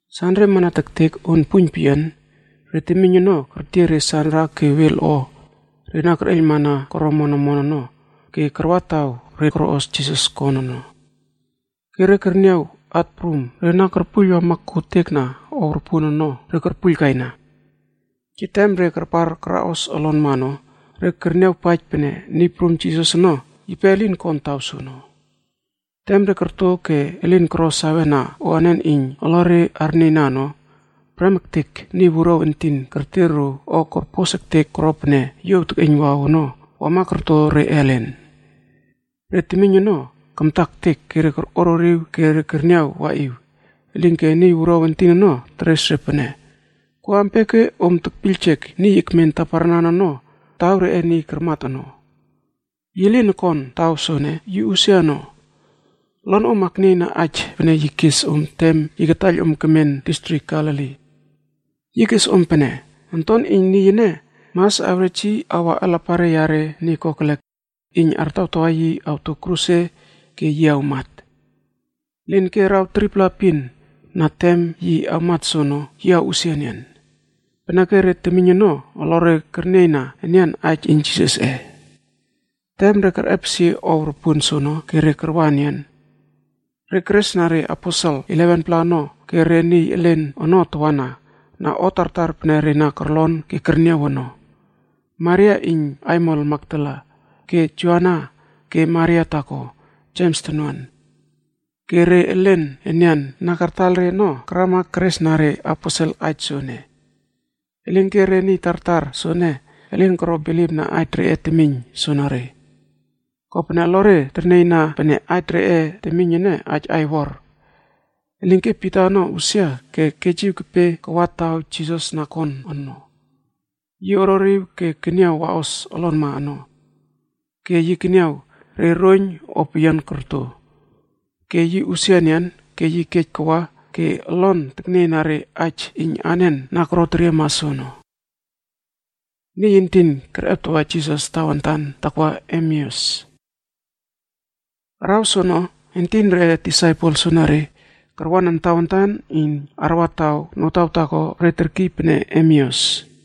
Sanre amana tektek on puiyn peyian, re temiyn ono kertiey re sanra ke wel o re na kerꞌeiylmana koro omon omon ono. Ke karwa taw re na koroꞌos Jisas kon ono. Ke re kerniaw at prum re na korpuiyl wama kotekna ow ropuon ono re korpuiylkaina. Ke tem re karpar karaꞌos olonma ono, re kerniawpaij pene Niy Prum Jisas ono yipe elin kon taw soono. Tem re korto ke elin koro sawena o anen iyn olore arnieyna ono, prem ektek niy wuruaw entin kerter ro o korpos ektek koro pene yuow tekꞌeiynwaw ono wama korto re ellen. Re temiyn ono, kamta ektek ke korꞌoririw ke kerniaw waꞌiw. Elinke niy wuruaw entin ono teres re pene, “Ko ampia ke om tekpiyljek niy ekmen taparnan ono, taw reꞌe niy karmat ono? Yi lin okon taw soene, yi usia ono. Olonom aknieyna aij pene yi kes om tem yi kataiyl om kemen distrik Galili. Yi kes om pene, ‘Onton iyn Niy ene, mas awrej yi awa alapare yare niy kokelek iyn artawtawa yi awto kruse ke yi awmat. Elinke araw 3-pla epin na tem yi awmat soono, yi awꞌusia enian.’” Peneke re temiyn ono, olore kernieyna enian aij iyn Jisasꞌe. Tem re kerꞌepesie ow ropuon soono ke re karwa enian. Re keresna re Aposel 11-pla ono ke re niy elen ono tawana na o tartar, pene re na korlon ke kerniaw ono. Maria iyn aimol Makdala, ke Joana ke Maria taako (Jems tonuan). Ke re elen enian na kartaiyl re ono karama keresna reaposel aij soene. Elinke re niy tartar soene, elin koro bilipna aij reꞌe temiyn soenere. Kopene olore ternieyna pene, aij reꞌe temiyn ene, aij aiwor. Elinke Pita ono usia ke kejiw kepe kawa taw Jisas na kon ono. Yi orꞌoriw ke keniaw waꞌos olonma ono. Ke yi keniaw re roiyn o peyian korto. Ke yi usia enian ke yi kej kawa. Ke olon teknieyna re aij iyn anen na koteriema soono. Niy entin kerꞌeptawa Jisas tawantan takwa Emeus. Araw soono, entin reꞌe disaipel soenere karwanan tawantan iyn arwa taw notaw taako re terkiy pene Emeus.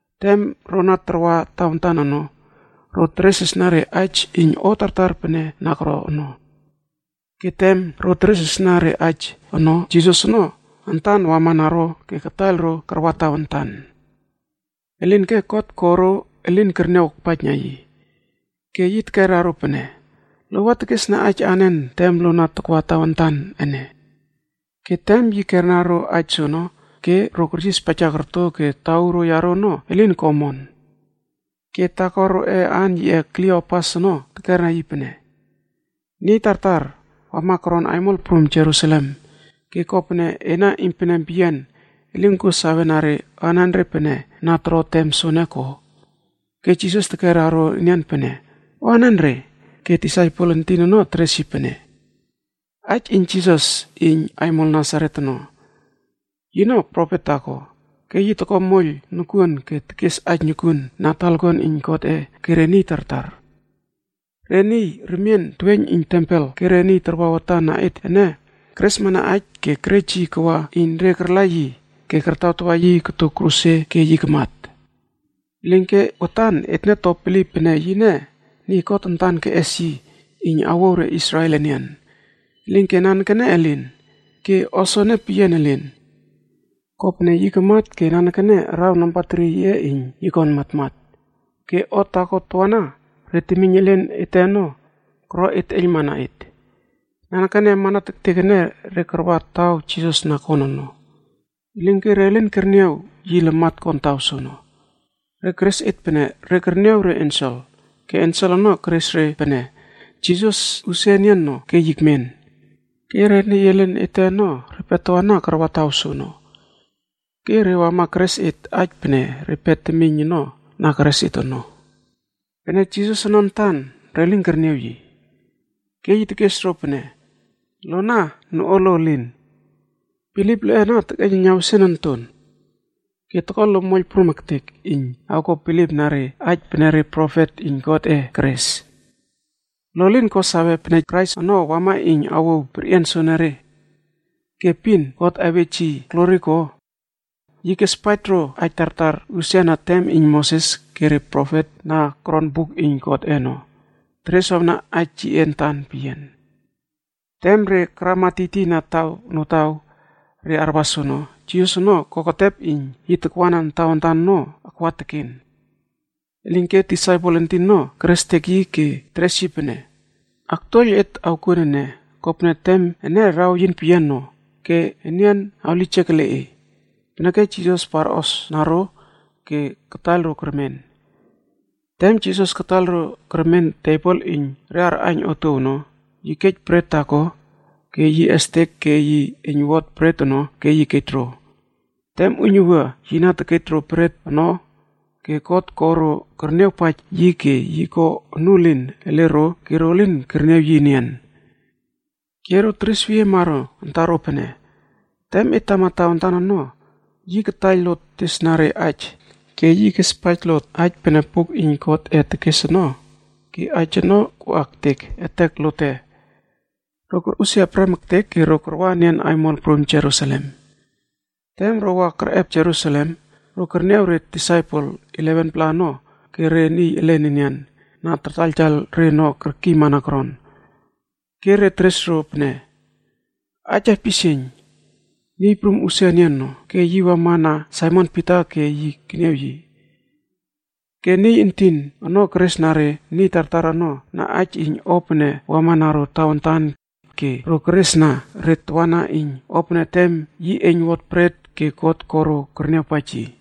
Tem ro na tarwa tawantan ono, ro teresresna re aij iyn o tartar pene na koro ono. Ke tem ro na teresresna re aij ono, Jisas ono antan wamana ro ke kataiyl ro karwa tawantan. Elinke God ko ro elin kerniaw akpaijna yi. Ke yi tekera ro pene, “Lo wa tekesna aij anen tem lo na takwa tawantan ene?” Ke tem yi kerna ro aij soono, ro keryispaija korto ke tauro yaro ono elin ko omon. Ke taako roꞌe aan yiꞌe Kliopas ono tekera yi pene, “Niy tartar wama koron aimol prum Jerusalem ke kopene ena iynpenem peyian elin kuo sawena anenre pene na toro tem soene ko?” Ke Jisas tekera ro enian pene, “O anenre?” Ke disaipel entin ono teres yi pene, “Aij iyn Jisas iyn aimol Nasaret ono. Yino profet taako, ke yi toko moiyl nokuon ke tekes aij nokuon na talakuan iyn Godꞌe ke re niy tartar. Re niy remien teweiyn iyn tempel ke re niy tarwa watan na et ene, keresmana aij. Ke kerej yi kawa iyn re karla yi ke kartawtawa yi koto kruse ke yi kamat. Elinke watan etne to bilip pene yine niy God antan keꞌes yi iyn awouw re Israel enian. Elinke nanekene elin. Ke o soene peyian elin, kopene yi kamat ke nanekene araw nambatri yiꞌe iyn yi kon matmatb. Ke o taako tawana, re temiyn elen ete ono koro et teꞌeiylmana et. Nanekene amana tektek ene, re karwa taw Jisas na kon ono. Elinke re lin kerniaw yi lamat kon taw soono. Re keres et pene re kerniaw re ensel, ke ensel ono keres re pene, Jisas usia enian ono ke yi ekmen. Ke re niy elen ete ono repe tawana karwa taw soono. Ke re wama keres et aij pene repe temiyn ono na keres et ono. Pene Jisas ono antan, re lin kerniaw yi.” Ke yi tekes ro pene, “Lona noꞌualo elin. Bilip loꞌe ana tekeiyneiyna wesian onton. Ke toko lo moiyl prum ektek iyn awko bilipna re aij pene re profet iyn Godꞌe keres. Lo lin ko sawe pene Kraisc ono wama iyn awouw perꞌian soenere, ke epin God awej yi glori ko?” Yi kespaij ro aij tartar usia na tem iyn Moses ke re profet na koron buk iyn Godꞌe ono, tereswawna aij yiꞌe antan peyian. Tem re karama tiytiyna taw notaw re arwa soono, Jisas ono koketep iyn takwanan tawantan ono akwa teken. Elinke disaipel entin ono kerestek yi ke teres yi pene, “Aktuoiyl et awkuon ene, kopene tem ene raweyin peyian no ke nian awlijek ele e.” Peneke Jisas parꞌosna ro ke kataiyl ro kermen. Tem Jisas kataiyl ro kermen tebol iyn re arꞌaiyn otuow ono, yi kej bret taako ke yi estek ke yi eiynwot bret ono ke yi kej ro. Tem uiynuwua yi na tekej ro bret ono ke God ko ro kerniawpaij yi ke yi ko onuelin ele ro ke ro lin kerniaw yi enian. Ke ro teresweyiema ro antaro pene, “Tem et tama tawantan ono, yi kataiyl lot tesna re aij ke yi kespaij lot aij pene buk iyn Godꞌe tekes ono ke aij ono koꞌa ektek etek lote.” Ro korꞌusia prem ektek ke ro karwa enian aimol prum Jerusalem. Tem ro wa kerꞌep Jerusalem, ro kerniaw re disaipel 11-pla ono ke re niy elen enian na tartaiyl re ono kerkiymana koron. Ke re teres ro pene, “Aij aipisieiyn! Niy Prum usia enian ono ke yi wamana Saimon Pita ke yi keniaw yi.” Ke niy entin ono keresna re niy tartar ono na aij iyn o pene wama na ro tawantan. Ke ro keresna re tawana iyn o pene tem yi eiynwot bret ke God ko ro kerniawpaij yi.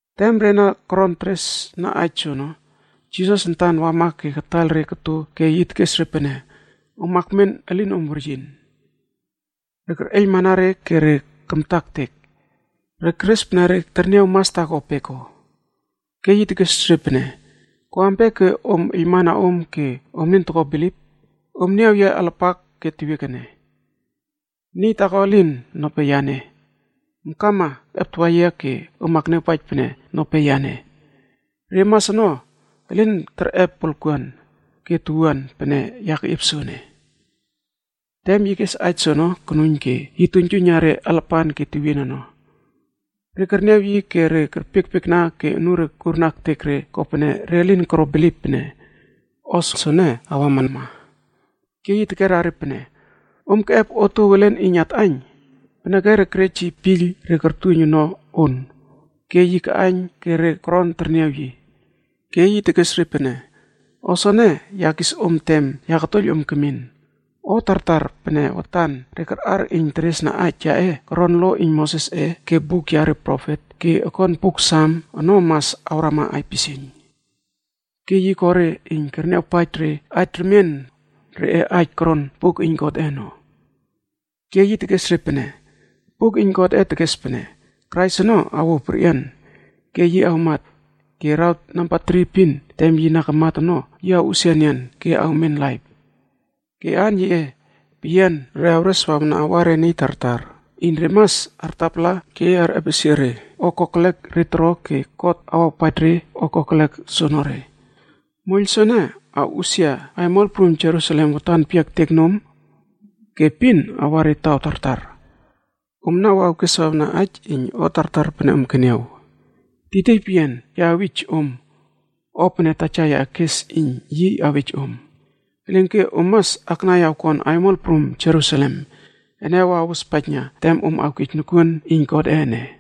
Tem re na koron teresna aij soono, Jisas antan wama ke koto re elen ke yi tekes re pene, “Om akmen elinom weryin.” Re kerꞌeiylmana re ke re kamta ektek. Re keres pene re terniaw mas taako peko. Ke yi tekes re pene, “Ko ampia ke om eiylmana om ke om elin toko bilip? Om niaw yia alapak ke tewiek ene. Niy taako elin, nope yane! Om kama akꞌeptawa yia ke om akniawpaij pene nope yane. Re mas ono, elin terꞌep wolkuan ke towuan pene ya keꞌiep soene.” Tem yi kes aij soono konuiyn ke yi tuiynjuiyna re alapan ke tewien ono. Re kerniaw yi ke re kerpiekpiekna ke unure kurna ektek re kopene re lin koro bilip pene o soene awama. Ke yi tekera re pene, “Om keꞌep otuow elen iyn atꞌaiyn?” Peneke re kerej yi piyl re kortuiyn ono on, ke yi kaꞌaiyn ke re koron terniaw yi. Ke yi tekes re pene, “O soene ya kis om tem ya katuoiyl om kemin. O tartar pene watan re karꞌar iyn teresna aij yaꞌe, koron lo iyn Mosesꞌe ke buk yare profet ke okon buk Sam ono mas awrama aipisieiyn.” Ke yi ko re iyn kerniawpaij re aij remien, reꞌe aij koron buk iyn Godꞌe ono. Ke yi tekes re pene, “Buk iyn Godꞌe tekes pene, Krais ono awouw perꞌian ke yi awmat. Ke araw nambatri epina tem yi na kamat ono, yi awꞌusia enian ke awmen laip. Ke aan yiꞌe peyian re awreswawna awa re niy tartar iyn re mas artapala ke arꞌepesie re o kokelek re toro. Ke God awawpaij re o kokelek soonore. Moiyl soene awꞌusia aimol prum Jerusalem watan peyia ektek nom. Ke epin awa re taw tartar. Omna wa awkeswawna aij iyn o tartar pene om keniaw. Tiytiy peyian ya awij om o pene Taja yaꞌe kespaij iyn yi awej om. Elinke om mas aknai awkon aimol prum Jerusalem ene awospaijna tem om awkej nokuon iyn Godꞌe ene.”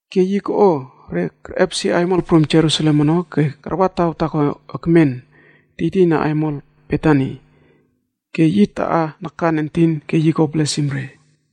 Ke yi koꞌo re kerꞌepesie aimol prum Jerusalem ono ke karwa taw taako ekmen tiytiyna aimol Betani, ke yi taꞌa nakan entin ke yi ko blesimd re.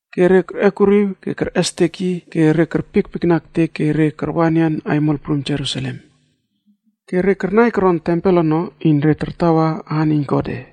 Ke re kerꞌekuriw ke kerꞌestek yi ke re kerpiekpiekna ektek ke re karwa enian aimol prum Jerusalem. Ke re karnai koron tempel ono, iyn re tartawa aan iyn Godꞌe.